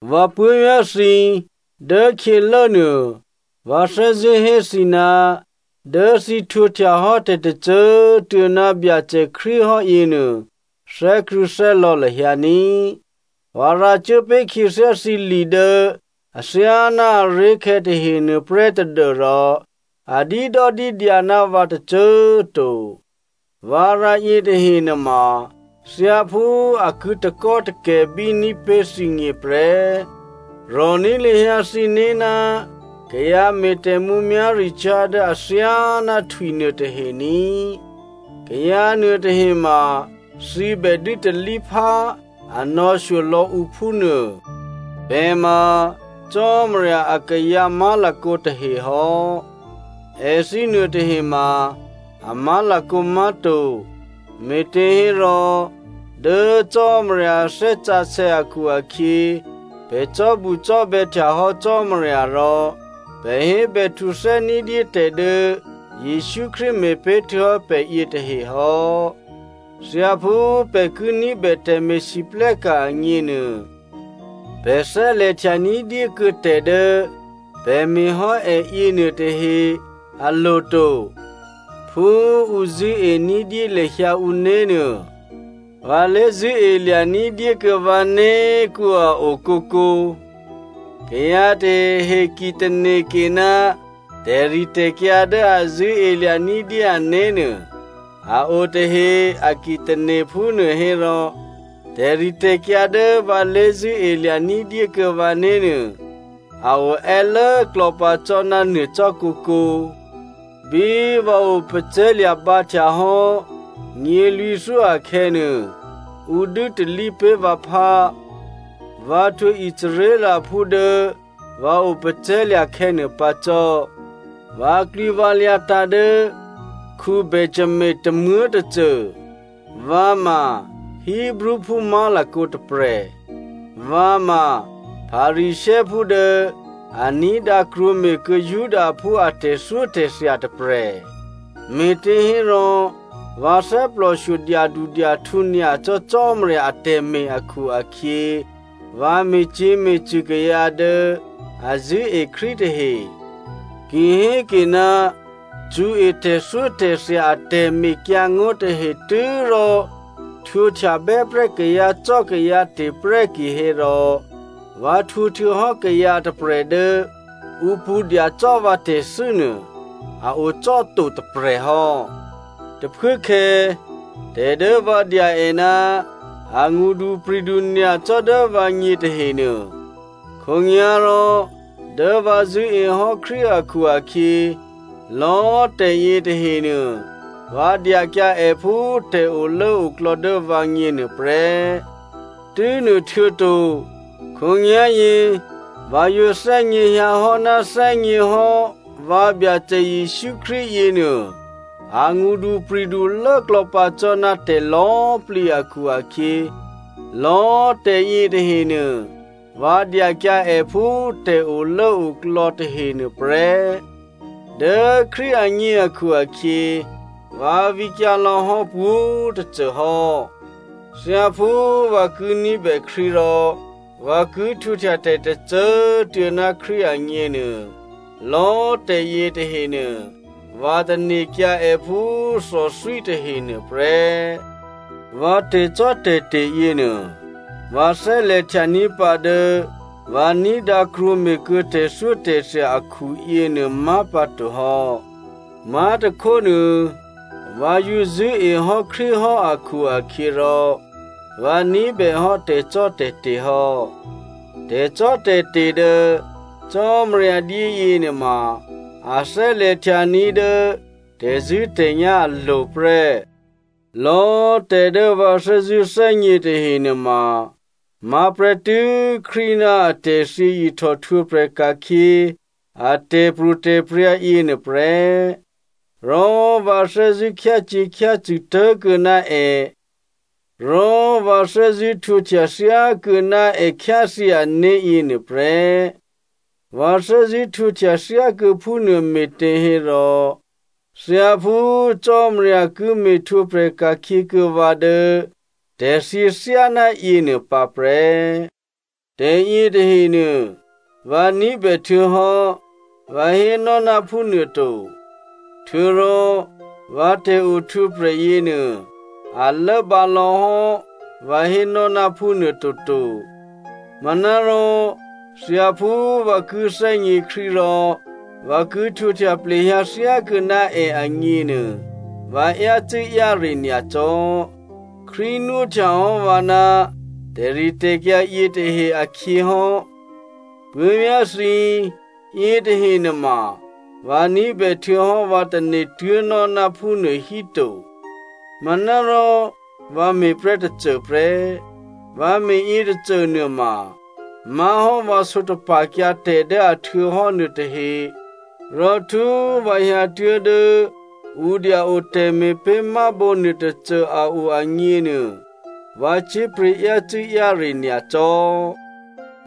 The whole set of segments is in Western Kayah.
Vǎ puố̤vyá̤ thǐ, dốkhyělốnuô, vǎ thè́zṳ̂́ hé thǐ, dố thǐ htwǒhtya hò́ tè̤tôcô꤮ tuô̌ ná Byacè Krístu hò́ yěnuô, thè́krṳ̂̌thè́lò̌ lahyǎ ní꤮. Vǎ rǎcuố pé̤ khyěthyá thǐ li dố athyáná aré̤khè̌ tahenuô prè́ tadû́rò a dídòdídyǎ ná vǎ tôcô꤮ to. Vǎ rǎ yětahe nuôma thyáphú a ki takò́takè̤bí ní̤pé̤ thǐgněprè́. Rò̤ní̤ lahyǎ thǐné̤ ná kayǎ me̤ tè̤mǔmyá̤ricyá̤ dố athyáná htwi nuôtahe ní꤮. Kayǎ nuôtahe ma thǐ bè dû́talíphá a nò̌shyo lò̌ ǔ phúnuô. Pè̤ ma Cò́marya akayǎ má̤lakǒ tahe hò́, èthǐ nuôtahe ma a má̤lakǒ má̤to, me̤těhérò dố Cò́marya a Thè́ Sǎsè̌ akhu-akhyě pè̤ cò́bucò́bè̌htya hò́ Cò́marya rò pè̤ hébèhtuthè́ ní̤dyé tè̤dố Jesǔ Krístu me̤pé̤ htuô̌hò́ pè̤ yětahe hò́. Thyáphú pè̤ ki ní̤bè tè̤me̤lwóhteka̤ agněnuô, pè̤ thè́lè̤htya ní̤dyé kuô̌ tè̤dố pè̤ me̤ hò́ è yěnuôtahe alo̤ to. Phú ǔ zṳ̂́e ní̤dyé lahyǎ ǔné̤nuô, vǎ lé̤zṳ̂́elya̤ ní̤dyékuô̌ vǎné̤ kǔ꤮ a o kǒkǒ. Kayǎ tahehe ki tane̤ke ná tè̤ritè̤kyǎ dố a zṳ̂́elya̤ ní̤dyé ané̤nuô a o tahe a ki tane̤ phúnuôhérò tè̤ritè̤kyǎ dố vǎ lé̤zṳ̂́elya̤ ní̤dyé kuô̌ vǎné̤nuô a o è́lốklò̌ pǎ cò́ ná nuô cò́ kǒkǒ. Bí vǎ opacè̤̌lya̤ bǎhtya hò́ nyělwǐ̤thyó akhè̌nuô, ǔ dû́talí pé̤ vǎphá. Vǎ htwǒ Israelphú dố vǎ opacè̤̌lya̤ khè̌nuô pǎ cò́. Vǎklwǐvǎlyǎ tǎ̤ dố Benjamino tômuố̤tôcô, vǎ ma Hebreophú má̤lakǒ tôprè̤. Vǎ ma Pharisěophú dố a ní̤dǎ krwǒme̤kuô̌ Judaphú a tè̤thyótè̤thya tôprè̤. Me̤těhérò vǎ thè́plòshyo dyadudyahtǔ nyacò́ Cò́marya atè̤me̤ akhu-akhyě vǎ me̤cyě̤me̤cṳ̂ kayǎ dố a zṳ̂́e Krístu tahe. Ki héke ná cṳ̌e tè̤thyótè̤thya a tè̤mekyǎngó̤ tahe tû́rò htwǒhtya bè́prè́ kayǎcò́kayǎte̤ prè́ kihérò, vǎ htwǒ htuô̌hò́ kayǎ tôprè̤ dố ǔ pṳ̌ dyacò́ vǎ tè̤thû́ nuô, a ocò́to tôprè̤ hò́. Tôphuốkhè̌ tè̤ dố vǎ dya è ná angṳdupri̤du nyacò́ dố vǎgně tahenuô, khǒnyá̤rò dố vǎ zṳ̂́e hò́ Krístu akhu-akhyě, lò̌꤮ tè̤ yětahenuô vǎ dyakyǎ è phú tè̤olốoklò̌ dố vǎgně nuôprè́. Tû́nuôhtuô̌to, khǒnyá̤yě vǎ yǒ thè́gněhyǎhò́ ná thè́gněhò́ vǎ Byacè Jesǔ Krístu yěnuô a ngṳdupri̤du lốklò̌pǎ cò́ ná tè̤lò̌꤮ plǐ akhu-akhyě, lò̌꤮ tè̤ yětahenuô, vǎ dyakyǎ è phú tè̤olốoklò̌ tahenuô prè́. Dố Krístu agně akhu-akhyě, vǎ vǐkyǎ lò̌hò́ pwǒ̤꤮ tôcô hò́. Thyáphú vǎ ki ní̤bè Krístu rò vǎ ki htwǒhtya tè̤ tôcô꤮ tuô̌ ná Krístu agněnuô, lò̌꤮ tè̤ yětahenuô, vǎ tane̤kyǎ̤ è phú thòthwí tahenuô prè́. Vǎ tè̤cò́tè̤te̤ yěnuô, vǎ thè́lè̤htyaní̤ pǎ dố vǎ ní̤dǎ krwǒme̤ kuô̌ tè̤thyótè̤thya akhu yěnuô má̤pǎtohò́. Má̤tôkhónuô, vǎ yǒ zṳ̂́ehò́ Krístu hò́ akhu-akhyěrò vǎ ní̤bèhò́ tè̤cò́tè̤te̤ hò́. Tè̤cò́tè̤te̤ dố Cò́marya dyé yěnuôma a thè́lè̤htyaní̤ dố tè̤zṳ̂́tè̤nyá̤ alo̤ prè́. Lò̌꤮ tè̤ dố vǎ thè́zṳ̂́ thè́gně tahe nuôma má̤ prè́tû́ Krístu ná atè̤thyě ihtòhtwǒprè̤ ka̤khyě a tè̤pro̤tè̤prya̤ yěnuô prè́, rò vǎ thè́zṳ̂́ khyácyě̤khyácṳ̂ tố̤kuô̌ná è, rò vǎ thè́zṳ̂́ htwǒhtya thyákuô̌ ná è khyáthyě ané̤ yěnuô prè́. Vǎ thè́zṳ̂́ htwǒhtya thyákuô̌ phúnuô me̤těhérò thyáphú Cò́marya ki me̤htwǒprè̤ ka̤khyěkuô̌ vǎ dố tè̤thyě thyáná yěnuô pǎ prè́. Tè̤yětahenuô vǎ ní̤bè htuô̌hò́ vǎ hénò́ ná phúnuôto, htuô̌rò vǎ tè̤ohtwǒprè̤ yěnuô, a lốbǎ lò̌hò́ vǎ hénò́ ná phúnuô toto. Manárò thyáphú vǎ ki thè́gně Krístu rò vǎ ki htwǒhtya plehyǎ thyákuô̌ná è agněnuô, vǎ yácû́-yáre nyacò́. Krístu nwóhtya hò́ vǎ ná tè̤ritè̤kyǎ yětahe akhyěhò́. Puố̤vyá̤ thǐ꤮, yětahe nuôma, vǎ ní̤bè htuô̌hò́ vǎ tane̤ tuố̤nò́ ná phúnuô hí to. Manárò vǎ me̤prè́ tôcôprè́. Vǎ me̤ yětôcô nuôma má̤hò́ vǎ sǒtapa̤kyǎ tè̤ dố a htuô̌hò́ nuôtahe, rò htú꤮ vǎ hyǎtuố̤ dố ǔ dya-o tè̤me̤pé̤mábǒ nuôtôcô a o agněnuô, vǎ cyé̤pryě̤ yácû́-yáre nyacò́.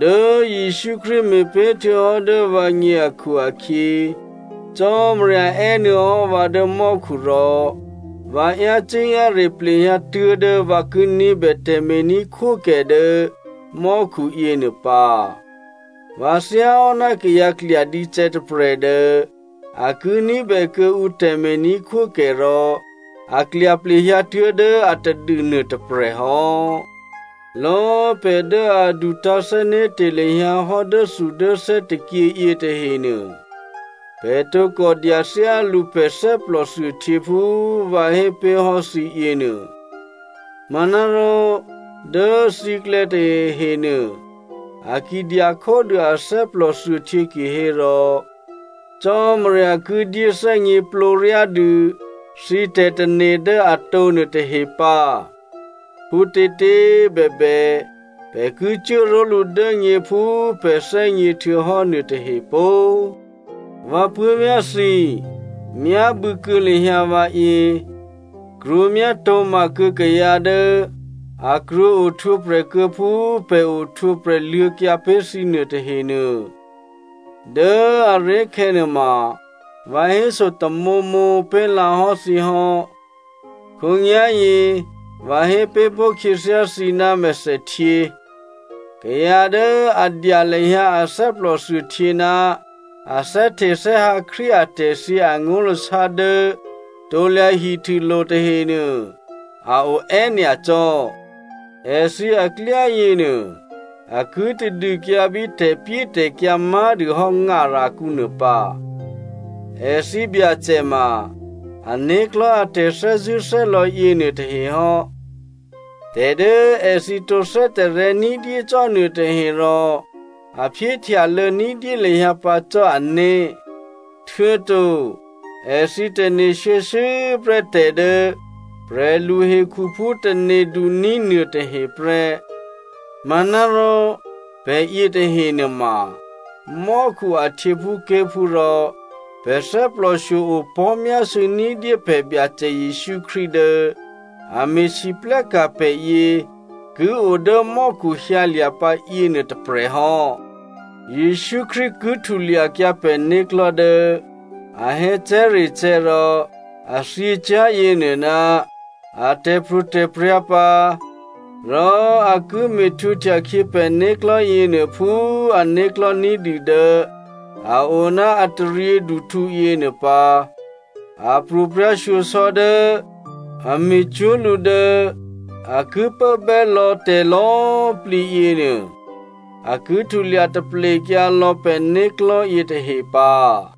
Dố Jesǔ Krístu me̤pé̤ htuô̌hò́ dố vǎgně akhu-akhyě Cò́marya è́nuô̌ hò́ vǎ dố mò́khu rò vǎ yácû́-yáre plehyǎ tuố̤dố vǎ ki ní̤bè tè̤me̤ní̤khwókè dố mò́khu yěnuô pǎ. Vǎ thyáhò́ná kayǎ klyadícè̌ tôprè̤ dố a ki ní̤bè kuô̌ǔ tè̤me̤ní̤khwókè rò a klya plehyǎ tuố̤dố atadû nuôtôprè̤ hò́. Lò̌꤮ pè̤ dố a dutǎ̤thè́né̤te̤ lahyǎ hò́ dốthudốthè́ tôkyě yětahenuô, pè̤ tǒkò dya thyálǔ pè̤ thè́plòthuôhtyě phú vǎ hépé̤hò́ thǐ yěnuô. Manárò dố thǐklè̌ tahehe nuô, a ki dya khódû a thè́plòthuôhtyě kihérò, Cò́marya ki dyé thè́gněplǒryá dû thǐ tè̤tane̤ dố atǒ nuôtahe pǎ. Phútětě꤮ bèbè, pè̤ ki cuố ró̤lǔ dố nyě phú pè̤ thè́gně htuô̌hò́ nuôtahe pó꤮. Vǎ puố̤vyá̤ thǐ, myábû̌ kuô̌ lahyǎ vǎyě, krwǒ myátǒma kuô̌ kayǎ dố a krwǒ ohtwǒprè̤ kuô̌ phú pè̤ ohtwǒprè̤ luô̌kyǎ pé̤ thǐ nuô tahenuô. Dố aré̤khè̌nuô ma, vǎ héso tamǒmǒ pé̤lǎ hò́ thǐ hò́. Khǒnyá̤yě vǎ hé pé̤ pó̤ khyěthyá thǐ ná mèthèhtyě. Kayǎ dố a dya lahyǎ a thè́plòthuôhtyě ná a thè́htethè́hǎ Krístu atè̤thyě angó̤lasá dố krusulo̤ tahenuô a o è́nyacò́. Èthǐ aklyá yěnuô a ki tadûkyǎ bí tè̤pyétè̤kyǎ má̤dûhò́ ngarakǔ nuô pǎ. Èthǐ byacè ma ané̤klò̤́ a tè̤thè́zṳ̂́thè́lò̌ yěnuô tahe hò́. Tè̤dố èthǐ tǒ thè́tarè̤̌ ní̤dyé cò́ nuôtahe rò a phyéhtyalô̌ ní̤dyé lahyǎ pǎ cò́ ané̤. Htuô̌to èthǐ tane̤ shuô̌shuô̌ prè́ tè̤ dố prè̤luhekhuphú tane̤duní̤ nuôtahe prè́. Manárò pè̤yě tahe nuôma mò́khu a htyěphúké̤phú rò pè̤ thè́plòshyo opò̤́myásû̌ ní̤dyé pè̤ Byacè Jesǔ Krístu dố a me̤lwóhteka̤ pè̤yě ki o dố mò́khu hyǎlya̤ pǎ yěnuô tôprè̤ hò́. Jesǔ Krístu ki htulyakyǎ pè̤né̤klò̤́ dố a hè̌cè̤́recè̤́ rò a thyěcyá̤ yěnuô ná a tè̤pro̤tè̤prya̤ pǎ, rò a ki me̤htwǒhtyakhyě pè̤né̤klò̤́ yěnuô phú ané̤klò̤́ ní̤dû dố a o ná a taryěduhtǔ yěnuô pǎ. A pro̤prya̤shyosò̌ dố a me̤cwó̤ lǔ dố a ki pốbè́ lò̌ tè̤lò̌꤮ plǐ yěnuô, a ki htulya taplekyǎ lò̌ pè̤né̤klò̤́ yětahe pǎ.